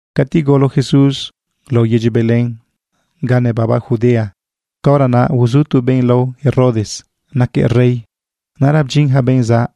Cati golo Jesús lao yedyi Belén ga nebaba Judea, caora naꞌ uzu tu benꞌ lao Herodes naquëꞌ rey. Naꞌra bdyin ja benꞌ zaꞌ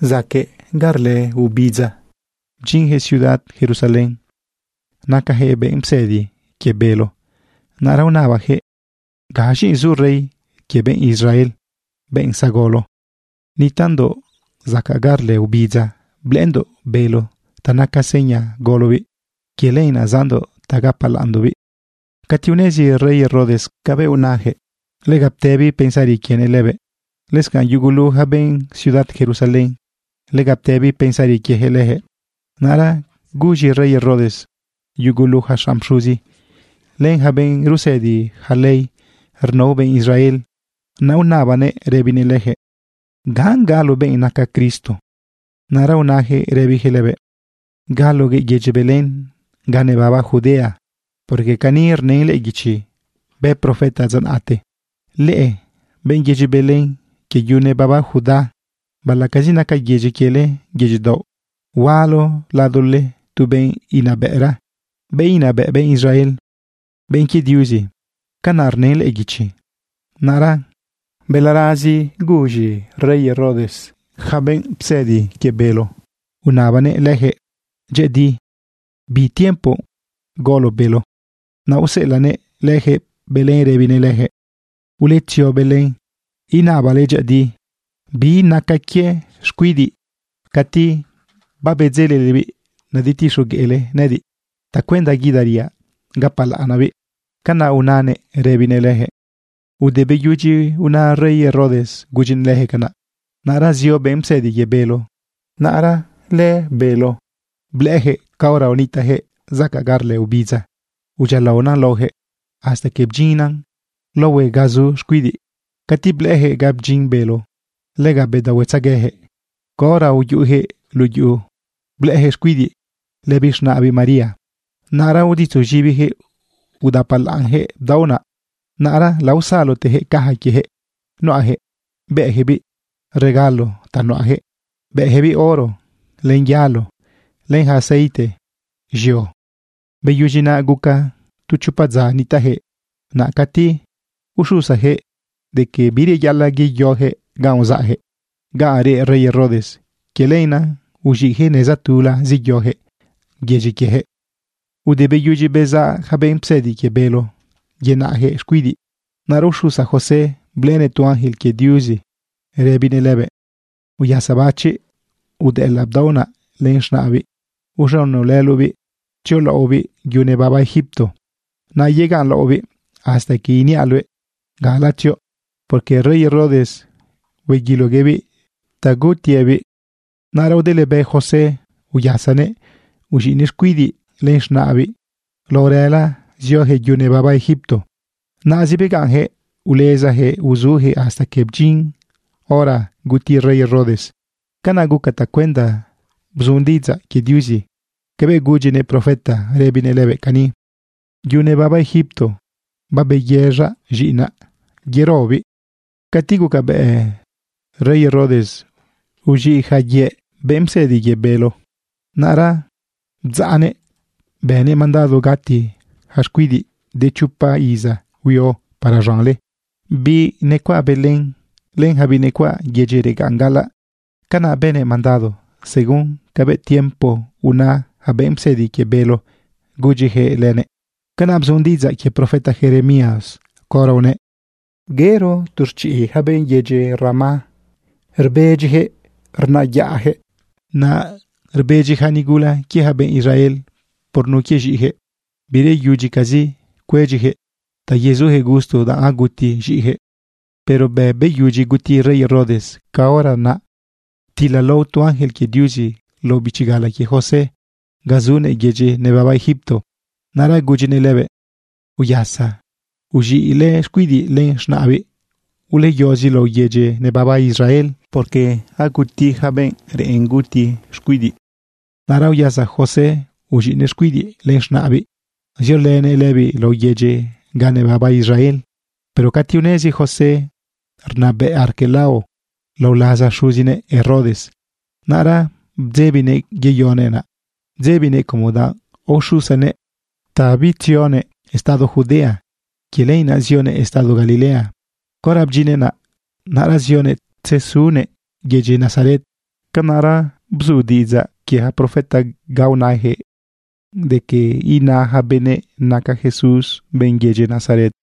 zacaꞌ ga rlë obidza, bdyinjëꞌ ciudad Jerusalén. Nacajëꞌ benꞌ psëdi quie bélo. Naꞌra unabajëꞌ: ―¿Gaz̃i zu rey quie benꞌ Israel, benꞌ zagolo? Nitaꞌndoꞌ zacaꞌ ga rlë obidza blëꞌëndoꞌ bélo ta naca seña golobiꞌ. Quie lenaꞌ zaꞌndoꞌ ta gapalaꞌnndoꞌbiꞌ. Cati unezi rey Herodes cabëꞌ unayaquëꞌ, lega ptëbi pensari quienëꞌ lëbëꞌ. Lëscanꞌ yugulu ja benꞌ ciudad Jerusalén, lega ptëbi pensari quiejëꞌ lëjëꞌ. Naꞌra guz̃i rey Herodes yugulu ja xanꞌ pxuzi len ja benꞌ rusëdi ja ley rnao benꞌ Israel. Naꞌ unabanëꞌ rëbinëꞌ lëjëꞌ: ―¿Ganꞌ galo benꞌ naca Cristo? Naꞌ ra unajëꞌ rëbijëꞌ lëbëꞌ: ―Galoguëꞌ yedyi Belén ga nebaba Judea, porque cani rnën lëꞌë guichi bë profeta dza naꞌte: Leꞌe benꞌ yedyi Belén quie yu nebaba Judá, baꞌalaꞌcazi naca yedyi quiele yedyi daoꞌ, hualo ladole tu benꞌ inabëꞌra, benꞌ inabëꞌ benꞌ Israel, benꞌ quie Diuzi. Canaꞌ rnën lëꞌë guichi. Naꞌra balarazi guz̃i rey Herodes yaca benꞌ psëdi quie bélo. Unabanëꞌ lëjëꞌ dyëꞌëdi bi tiempo golo bélo. Naꞌ useꞌelaꞌnëꞌ lëjëꞌ Belén rëbinëꞌ lëjëꞌ: ―Uletzio Belén inabale dyëꞌëdi bi raca quie xcuidiꞌ. Cati babedzelelebiꞌ nadetixogueꞌle nëꞌëdiꞌ tacuenda guidariaꞌ gapalaꞌnaꞌbiꞌ. ―Canaꞌ unanëꞌ rëbinëꞌ lëjëꞌ. Te beyudyi una rey Herodes gudyijëꞌ lëjëꞌ canaꞌ, naꞌra zio benꞌ psëdi quie bélo. Naꞌra lëbélo blëꞌëjëꞌ caora nitaꞌjëꞌ zacaꞌ ga rlë obidza, udyialaona laojëꞌ hasta que bdyinnan laohue ga zu xcuidiꞌ. Cati blëꞌëjëꞌ ga bdyin bélo, lega bedaohuetzeguejëꞌ. Caora uyuꞌujëꞌ luꞌu yuꞌu, blëꞌëjëꞌ xcuidiꞌ lëbiꞌ z̃naꞌbiꞌ María. Naꞌra uditzuz̃ibijëꞌ udapalaꞌnjëꞌ bdaoꞌ naꞌ. Naꞌra laosalotejëꞌ caja quiejëꞌ nuꞌajëꞌ, bëꞌjëꞌbiꞌ regalo ta nuꞌajëꞌ, bëꞌjëꞌbiꞌ oro len yalo len ja aceite z̃io. Beyudyi naꞌ, guca tu chopa dza nitaꞌjëꞌ naꞌ cati uxusajëꞌ de que bireyaꞌalaꞌ yeyojëꞌ ganꞌ uzaꞌjëꞌ, ganꞌ reꞌ rey Herodes. Quie lenaꞌ uz̃iꞌjëꞌ neza tula zeyojëꞌ yedyi quiejëꞌ. Ude beyudyi bezaꞌ ja benꞌ psëdi quie bélo yenaꞌjëꞌ xcuidiꞌ, naꞌra uxusa José blëꞌënëꞌ tu ángel quie Diuzi rëbinëꞌ lëbëꞌ: ―Uyasabachiꞌ udëꞌëlaꞌ bdaoꞌ naꞌ len z̃naꞌbiꞌ. Uz̃unolëloꞌbiꞌ tziolaꞌobiꞌ yu nebaba Egipto. Naꞌ yegaꞌnlaꞌobiꞌ hasta que iniaꞌ luëꞌ gala tzioꞌ, porque rey Herodes hueguiloguëꞌbiꞌ ta gutiëꞌbiꞌ. Naꞌra udëlebë José, uyasanëꞌ, uz̃iꞌnëꞌ xcuidiꞌ len z̃naꞌbiꞌ lao rëla ziojëꞌ yu nebaba Egipto. Naꞌzi begaꞌnjëꞌ ulezajëꞌ uzujëꞌ hasta que bdyin hora guti rey Herodes. Canaꞌ guca tacuenda bzu diꞌidzaꞌ quie Diuzi cabëꞌ gudyinëꞌ profeta rëbinëꞌ lëbëꞌ cani: “Yu nebaba Egipto babeyëz̃aꞌ z̃iꞌinaꞌ yerobiꞌ.” Cati gucabëꞌ rey Herodes uz̃iꞌ ja yëꞌ benꞌ psëdi quie bélo, naꞌra bdzaꞌnëꞌ, bënëꞌ mandado gati ja xcuidiꞌ de chopa iza huio para z̃anle, biꞌ necuaꞌ Belén len ja biꞌ necuaꞌ yedyi regaꞌn gaꞌalaꞌ. Canaꞌ bënëꞌ mandado según cabëꞌ tiempo una ja benꞌ psëdi quie bélo gudyijëꞌ lënëꞌ. Canaꞌ bzu diꞌidzaꞌ quie profeta Jeremías caora unëꞌ: Yero tu rchiꞌ ja benꞌ yedyi Ramá, rbedyijëꞌ rnayaꞌjëꞌ. Naꞌ rbedyi ja nigula quie ja benꞌ Israel por nun quie z̃iꞌijëꞌ. Bireyudyicazi cuedyijëꞌ ta yezujëꞌ gusto danꞌ aguti z̃iꞌijëꞌ. Pero bëꞌ beyudyi guti rey Herodes, caora naꞌ ptilalao tu ángel quie Diuzi lao bichi gala quie José ga zunëꞌ yedyi nebaba Egipto. Naꞌra gudyinëꞌ lëbëꞌ: ―Uyasa, uz̃iꞌlë xcuidiꞌ len z̃naꞌbiꞌ. Uleyozi lao yedyi nebaba Israel, porque aguti yaca benꞌ reꞌen guti xcuidiꞌ. Naꞌra uyasa José uz̃iꞌnëꞌ xcuidiꞌ len z̃naꞌbiꞌ, ziolënëꞌ lëbiꞌ lao yedyi ga nebaba Israel. Pero cati unezi José rnabëꞌ Arquelao lao laza xuzinëꞌ Herodes, naꞌra bdzebinëꞌ yeyonëꞌ naꞌ. Bdzebinëꞌ como danꞌ aoxusanëꞌ ta bitzionëꞌ estado Judea. Quie lenaꞌ zionëꞌ estado Galilea. Caora bdyinnëꞌ naꞌ, naꞌra zionëꞌ tzesunëꞌ yedyi Nazaret. Canaꞌra bzu diꞌidzaꞌ quie ja profeta ca unajëꞌ de quie ina ja benëꞌ naca Jesús benꞌ yedyi Nazaret.